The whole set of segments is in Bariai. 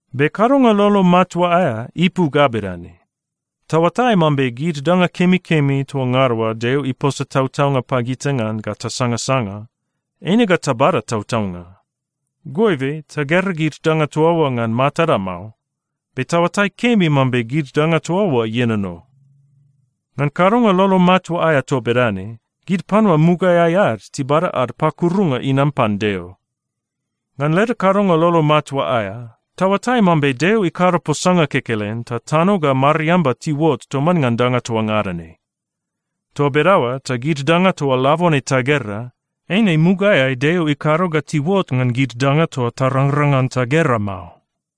Be kadonga lolo matua aea ipu ga bedane: Taoatai mambe gid danga kemikemi toa ngada oa Deo iposa tautaunga pagita ngan ga tasangasanga, eine ga tabada tautaunga. Goibe, tagera gid danga toa oa ngan matada mao, be taoatai kemi mambe gid danga toa oa ienono. Ngan kadonga lolo matua aea toa bedane, gid panua mugaeai ad tibada ad pakurunga inam pan Deo. Ngan leda kadonga lolo matua aea, taoatai mambe Deo ikado posanga kekelen ta tano ga mariamba tiuot toman ngan danga toa ngada ne. Toa bedaoa ta gid danga toa labone tagera, eine mugaeai Deo ikado ga tiuot ngan gid danga toa tarangrang ngan tagera mao.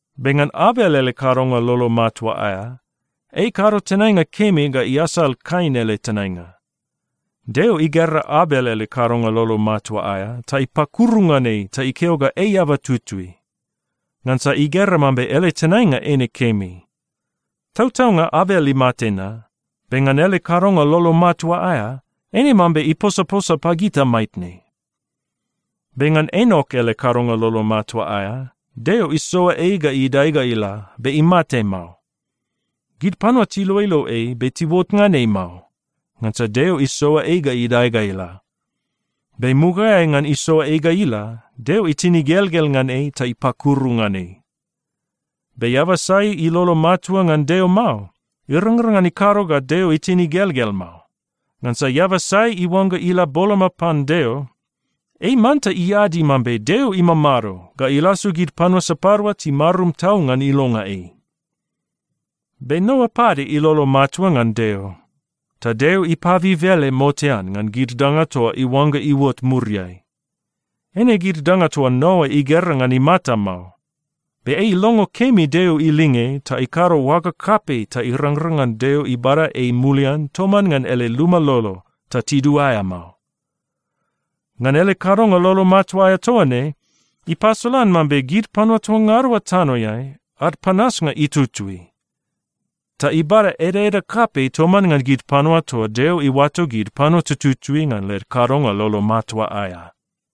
Be ngan Abel ele kadonga lolo matua aea, ei ikado tenainga kemi ga iasal Kain ele tenainga. Deo igera Abel ele kadonga lolo matua aea ta ipakuru ngan ei ta ikeo ga ei eaba tutui, ngansa igera mambe ele tenainga eine kemi. Tautaunga Abel imate na, be ngan ele kadonga lolo matua aea, eine mambe iposaposa pagita maitne. Be ngan Enok ele kadonga lolo matua aea, Deo isoa ei ga idae ga ila, be imate mao. Gid panua tiloilo ei, be tiuot ngan ei mao, ngansa Deo isoa ei ga idae ga ila. Be mugaeai ngan isoa ei ga ila, Deo itin igelgel ngan ei ta ipakuru ngan ei. Be eaba sai ilolo matua ngan Deo mao, irangrang ngan ikado ga Deo itin igelgel mao. Ngansa eaba sai iuangga ila boloma pan Deo, ei manta iadi mambe Deo imamado ga ilasu gid panua sapadua timarum tau ngan ilonga ei. Be Noa pade ilolo matua ngan Deo. Ta Deo ipabib ele motean ngan gid danga toa iuangga iuot muriai. Eine gid danga toa Noa igera ngan imata mao. Be ei ilongo kemi Deo ilinge ta ikado oaga kapei ta irangrang ngan Deo ibada ei mulian toman ngan ele luma lolo ta tiduaea mao. Ngan ele kadonga lolo matua aea toa ne, ipasolan mambe gid panua toa ngada oa tanoeai, ad panasnga itutui. Ta ibada edaeda kapei toman ngan gid panua toa Deo iuato gid panua tututui ngan led kadonga lolo matua aea.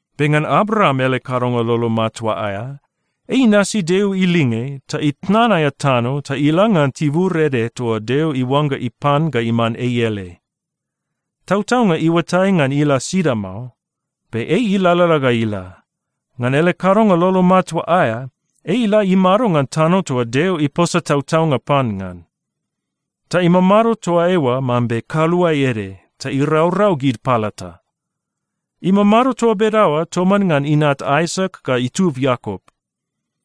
Be ngan Abraam ele kadonga lolo matua aea, ei inasi Deo ilinge ta itnan aea tano ta ila ngan tibur ede toa Deo iuangga ipan ga iman ei ele. Tautaunga iuatai ngan ila sida mao, be ei ilalala ga ila. Ngan ele kadonga lolo matua aea, ei ila imado ngan tano toa Deo iposa tautaunga pan ngan. Ta imamado toa eoa mambe kaluae ede ta iraurau gid palata. Imamado toa bedaoa toman ngan inat Aisak ga itub Iakop.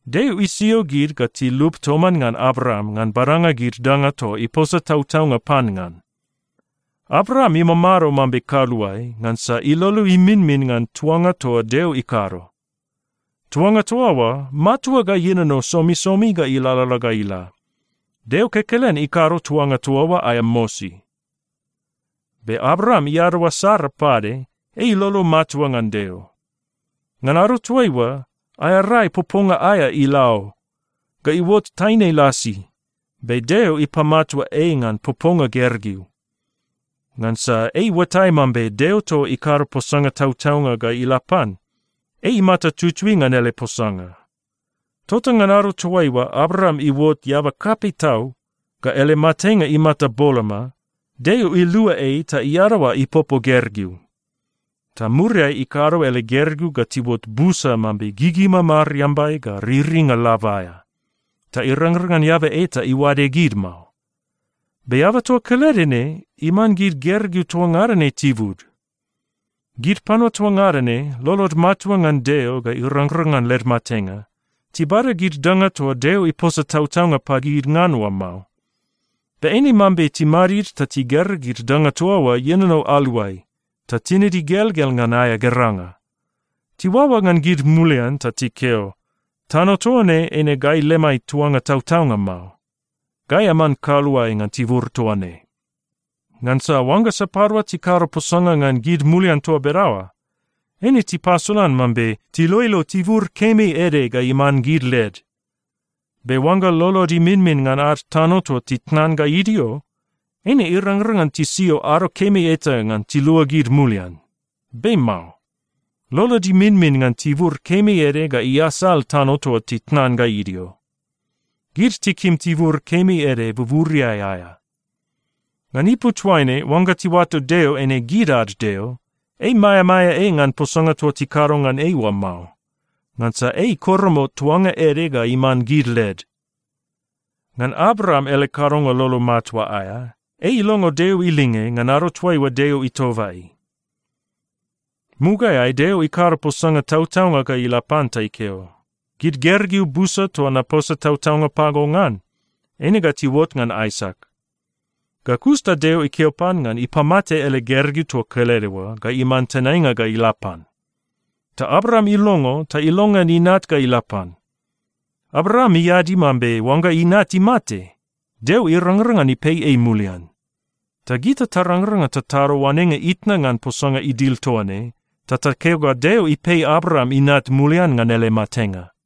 Deo isio gid ga tilup toman ngan Abraam ngan badanga gid danga toa iposa tautaunga pan ngan. Abraam imamado mambe kaluae, ngansa ilolo iminmin ngan tuanga toa Deo ikado. Tuanga toa oa matua ga ienono somisomi ga ilalala ga ila. Deo kekelen ikado tuanga toa oa aea mosi. Be Abraam iadaoa Sara pade, ei ilolo matua ngan Deo. Ngan ado toaiua, aea rai poponga aea ila o, ga iuot taine lasi, be Deo ipamatua ei ngan poponga gergeu. Ngansa ei iuatai mambe Deo toa ikado posanga tautaunga ga ila pan, ei imata tutui ngan ele posanga. Tota ngan ado toaiua Abraam iuot eaba kapei tau ga ele matenga imata boloma, Deo ilua ei ta iadaoa ipopo gergeu. Ta muriai ikado ele gergeu ga tiuot busa mambe gigima mariambai ga riringa lab aea, ta irangrang ngan eaba eta iuade gid mao. Be eaba toa kelede ne iman gid gergeu toa ngada ne tibud. Gid panua toa ngada ne, lolod matua ngan Deo ga irangrang ngan led matenga. Tibada gid danga toa Deo iposa tautaunga pagid ngan oa mao. Be eine mambe timadid ta tigera gid danga toa oa ienono aluai, ta tinid igelgel ngan aea geranga. Tiuaoa ngan gid mulian ta tikeo, “Tano toa ne eine gai lemai tuanga tautaunga mao. Gai aman kaluae ngan tibur toa ne.” Ngansa oangga sapadua tikado posanga ngan gid mulian toa bedaoa, eine tipasolan mambe tiloilo tibur kemi ede ga iman gid led. Be oangga lolod iminmin ngan ad tano toa titnan ga idio, eine irangrang ngan tisio ado kemi eta ngan tiluagid mulian. Be mao. Lolod iminmin ngan tibur kemi ede ga iasal tano toa titnan ga idio. Gid tikim tibur kemi ede buburiai aea. Ngan ipu toaine, oangga tiuato Deo eine gid ad Deo, ei maeamaea ei ngan posanga toa tikado ngan ei oa mao, ngansa ei ikoromot tuanga ede ga iman gid led. Ngan Abraam ele kadonga lolo matua aea, ei ilongo Deo ilinge ngan ado toaiua Deo itoba ei. Mugaeai Deo ikado posanga tautaunga ga ila pan ta ikeo, “Gid gergeu busa toa naposa tautaunga pago ngan, eine ga tiuot ngan Aisak.” Ga kus ta Deo ikeo pan ngan ipamate ele gergeu toa kelede oa ga iman tenainga ga ila pan. Ta Abraam ilongo ta ilongean inat ga ila pan. Abraam iadi mambe oangga inat imate, Deo irangrang ngan ipei ei mulian. Ta gita tarangrang ngan tatado oanenga itna ngan posanga idil toa ne, ta takeo ga Deo ipei Abraam inat mulian ngan ele matenga.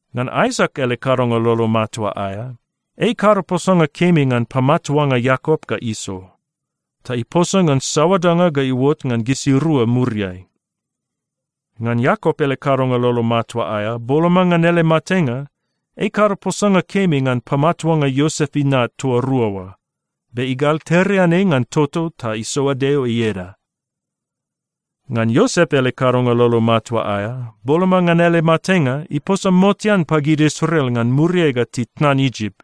Ngan Aisak ele kadonga lolo matua aea, ei ikado posanga kemi ngan pamatuanga Iakop ga Iso, ta iposa ngan saoa danga ga iuot ngan gisirua muriai. Ngan Iakop ele kadonga lolo matua aea, boloma ngan ele matenga, ei ikado posanga kemi ngan pamatuanga Iosep inat toa rua oa. Be igalterean ei ngan toto ta isoa Deo ieda. Ngan Iosep ele kadonga lolo matua aea, boloma ngan ele matenga, iposa motean pagid Israel ngan muriai ga titnan Isip.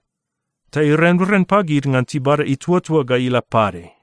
Ta irenren pagid ngan tibada ituatua ga ila pade.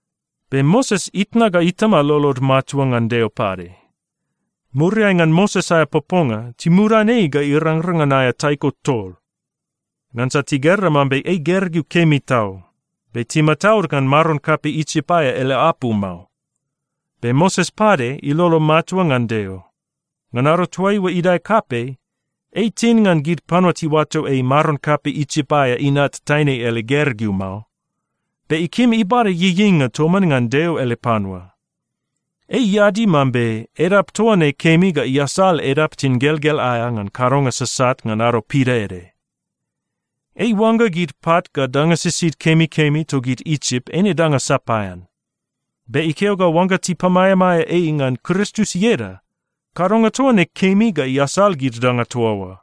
Be Moses itna ga itama lolod matua ngan Deo pade. Muriai ngan Moses aea poponga, timudan ei ga irangrang ngan aea taiko tol, ngansa tigera mambe ei gergeu kemi tau, be timataud ngan maron kapei Isip aea ele apu mao. Be Moses pade ilolo matua ngan Deo. Ngan ado toaiua idae kapei, ei itin ngan gid panua tiuato ei maron kapei Isip aea inat taine ele gergeu mao. Be ikim ibada ieieinga toman ngan Deo ele panua. Ei iadi mambe edap toa ne kemi ga iasal edap tingelgel aea ngan kadonga sasat ngan ado pidaede. Ei iuangga gid pat ga danga sisid kemikemi togid Isip eine danga sapaean. Be ikeo ga oangga tipamaeamaea ei ngan Kristus ieda, kadonga toa ne kemi ga iasal gid danga toa oa,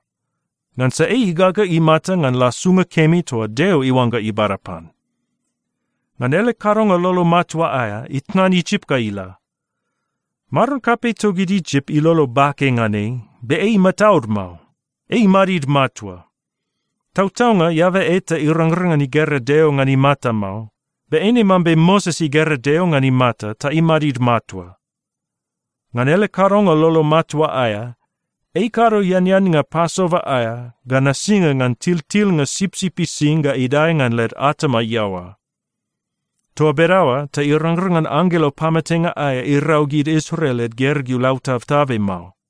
ngansa ei igaga imata ngan lasunga kemi toa Deo iuangga ibada pan. Ngan ele kadonga lolo matua aea, itnan Isip ga ila. Maron kapei togid Isip ilolo bake ngan ei, be ei imataud mao. Ei imadid matua. Tautaunga, eaba eta irangrang ngan igera Deo ngan imata mao, be eine mambe Moses igera Deo ngan imata ta imadid matua. Ngan ele kadonga lolo matua aea, ei ikado eaneannga Pasova aea ga nasinga ngan tiltilnga sipsip ising ga idae ngan led atama iaoa. Toa bedaoa ta irangrang ngan anggelo pamatenga aea irau gid Israel led gergeu lautabtabe mao.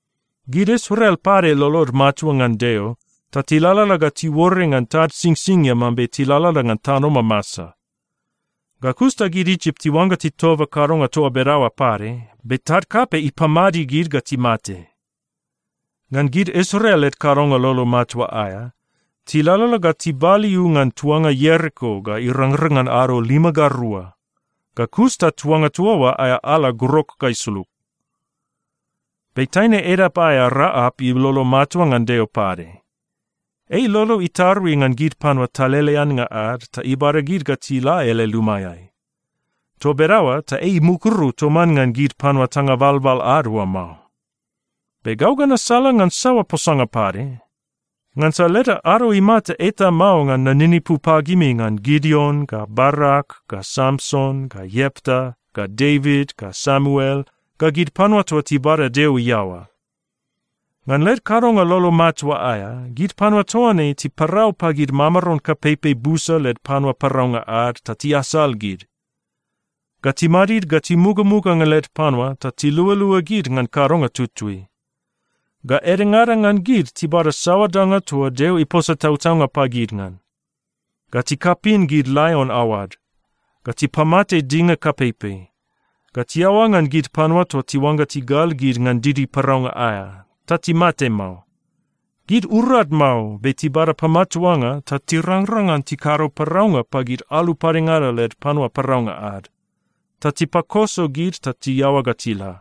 Gid Israel pade lolod matua ngan Deo ta tilalala ga tiuore ngan tad Singsingia mambe tilalala ngan tano mamasa. Ga kus ta gid Isip tiuangga titoba kadonga toa bedaoa pade, be tad kapei ipamadi gid ga timate. Ngan gid Israel led kadonga lolo matua aea, tilalala ga tibaliu ngan tuanga Ieriko ga irangrang ngan ado lima ga rua. Ga kus ta tuanga toa oa aea ala grok ga isulug. Be taine edap aea Raap ilolo matua ngan Deo pade. Ei ilolo itarui ngan gid panua taleleannga ad ta ibada gid ga tila ele lumaeai. Toa bedaoa ta ei imukuru toman ngan gid panua tanga balbal ad oa mao. Be gau ga nasalangan saoa posanga pade? Ngansa leda ado imata eta mao ngan naninipu pagimi ngan Gideon ga Barak ga Samson ga Iepta ga Devit ga Samuel ga gid panua toa tibada Deo iaoa. Ngan led kadonga lolo matua aea, gid panua toa ne tiparau pagid mamaron kapeipei busa led panua paraunga ad ta tiasal gid. Ga timadid ga timugamuga ngan led panua ta tilualua gid ngan kadonga tutui. Ga edengada ngan gid tibada saoa danga toa Deo iposa tautaunga pagid ngan. Ga tikapin gid laion aoad. Ga tipamate dinga kapeipei. Ga tiaoa ngan gid panua toa tiuangga tigal gid ngan didi paraunga aea, ta timate mao. Gid urad mao, be tibada pamatuanga ta tirangrang ngan tikado paraunga pagid alu padengada led panua paraunga ad, ta tipakoso gid ta tiaoa ga tila.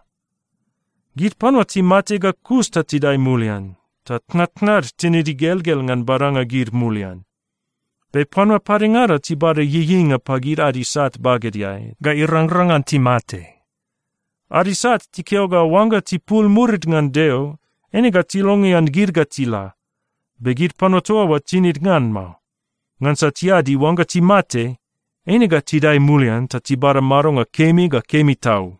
Gid panua timate ga kus ta tidae mulian, ta tnatnad tinid igelgel ngan badanga gid mulian. Be panua padengada tibada ieieinga pagid ad isat bagedeai ga irangrang ngan timate. Ad isat tikeo ga oangga tipul murid ngan Deo, eine ga tilongean gid ga tila, be gid panua toa oa tinid ngan mao, ngansa tiadi oangga timate, eine ga tidae mulian ta tibada madonga kemi ga kemi tau.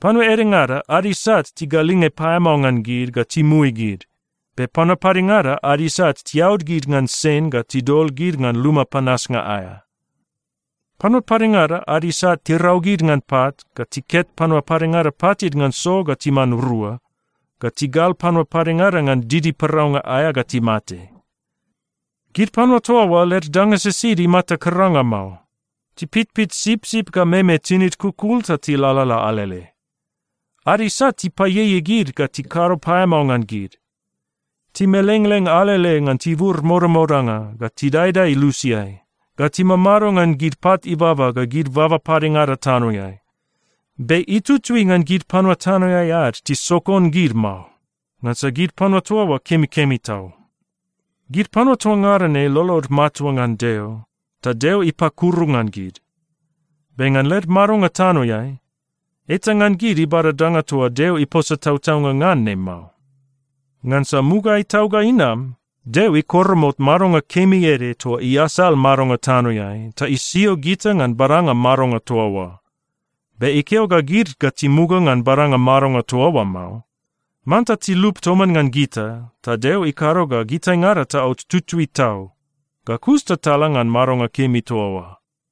Panua edengada, ad isat tigalinge paeamao ngan gid ga timui gid. Be panua padengada ad isat tiaud gid ngan sen ga tidol gid ngan luma panasnga aea. Panua padengada ad isat tirau gid ngan pat, ga tiket panua padengada patid ngan so ga timan rua, ga tigal padengada ngan didi paraunga aea ga timate. Gid panua toa oa, led danga sisid imata karanga mao. Tipitpit sipsip ga meme tinid kukul ta tilalala alele. Ad isat tipaieiei gid ga tikado paeamao ngan gid. Timelengleng alele ngan tibur modamodanga, ga tidaedae lusiai, ga timamado ngan gid pat ibaba ga gid baba padengada tanoeai. Be itutui ngan gid panua tanoeai ad tisokon gid mao, ngansa gid panua toa oa kemikemi tau. Gid panua toa ngada ne lolod matua ngan Deo, ta Deo ipakuru ngan gid. Be ngan led madonga tanoeai, eta ngan gid ibada danga toa Deo iposa tautaunga ngan ne mao. Ngansa mugaeai tau ga inam, Deo ikoromot madonga kemi ede toa iasal madonga tanoeai ta isio gita ngan badanga madonga toa oa. Be ikeo ga gid ga timuga ngan badanga madonga toa oa mao. Manta tilup toman ngan gita ta Deo ikado ga gitaingada taot tutui tau. Ga kus ta tala ngan madonga kemi toa oa.